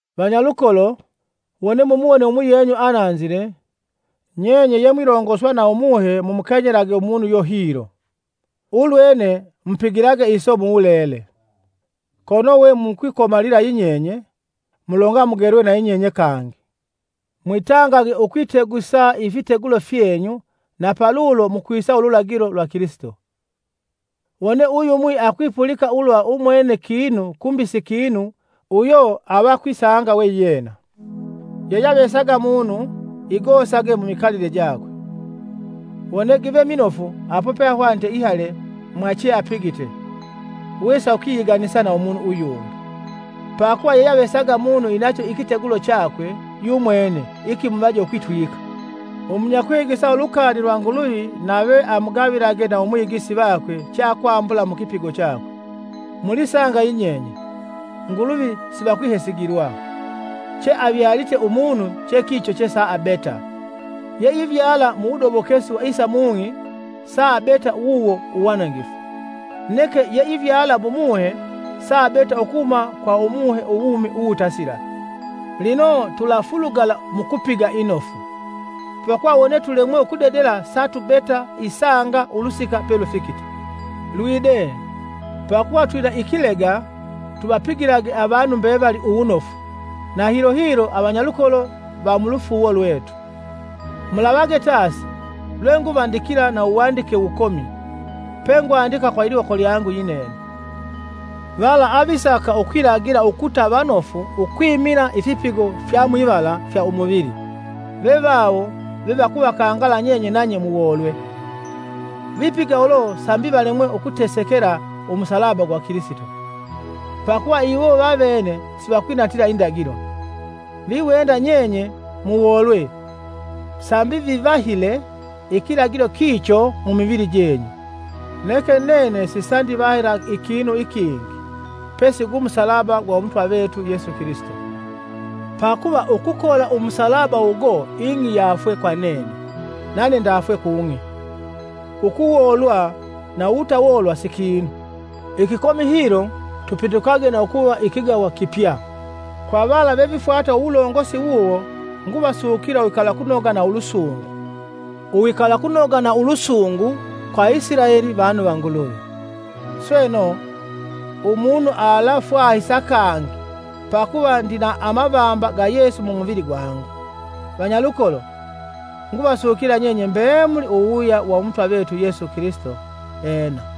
Vanyalukolo wone mumuwone umuyenyu ananzile, nyenye yemwilongoswa na Umuhe mumukenyelage umunu uyo hilo, ulwene mupigilage iso muwulele, kono we mukwikomalila yinyenye, mulongamugelwe na yinyenye kangi. Mwitangage ukwitegusa ifitegulo fyenyu na palulo mukwisa ululagilo lwa Kilisito. Wone uyumwi akwipulika ulwa umwene kinu kumbi si kinu, uyo ava akwisanga weiyena. Yeyeavesaga munu igosage mumikalile jakwe. Wone give minofu apo peahwanite ihela mwa cheapigite wesi akwiyiganisa na umunu uyungi. Pakuva yeyeavesaga munu inacho ikitegulo chakwe yumwene ikimuvaje ukwitwika. Umunyakwigisa ulukani lwa Nguluvi nave amugavilage na umwigisi vakwe cheakwambula mukipigo chakwe. Mulisanga yinyenye; Nguluvi sivakwihesigilwa, cheavyalite umunu chekicho chesaabeta. Ye ivyala muwudobokesi wa isa mung'i, saabeta wuwo uwanangifu, neke yeivyala mu muhe, saabeta ukuhuma kwa umuhe uwumi uwutasila. Lino, tulafulugala mukupiga inofu, pakuva wone tulemwe ukudedela satubeta isanga ulusika pelufikite. Lwide, pakuva twina ikilega, tuvapigilage avanu mbevali uwunofu; na hilo hilo avanyalukolo va mulufuuwo lwetu. Mulavage tasi, lwenguvandikila na Uwandike wukomi pengwandika kwa iliwoko lyangu yinene! Vala avisaka ukwilagila ukuta vanofu ukwimila ifipigo fya mwivala fya umuvili, ve vawo vekuvakangala nyenye nanye muwoolwe. vipiga ulo sambi valemwe ukutesekela umusalaba gwa Kilisito. Pakuva iwo vavene sivakwinatila indagilo, viwenda nyenye muwolwe sambi vivahile ikilagilo kicho mumivili jenyu. Neke nene sisandivahila ikinu kingi pesi umusalaba gwa Umutwa vetu Yesu Kilisito, pakuva ukukola umusalaba ugo ing'i yafwe kwa nene, nane ndafwe kung'i. Ukuwoolwa na uwutawoolwa si kinu, ikikomi hilo tupitukage na ukuva ikigawa kipya. Kwa vala vevifwata uwulongosi wuwo nguvasukila uwikalakunoga na ulusungu, uwikalakunoga na ulusungu kwa Isilaeli-vanu va Nguluvi. Sweno, umunu alafwahisa kangi pakuva ndina amavamba ga Yesu mumuvili gwangu. Vanyalukolo, nguvasukila nyenye mbemuli uwuwuya wa Umutwa vetu Kilisito, Ena.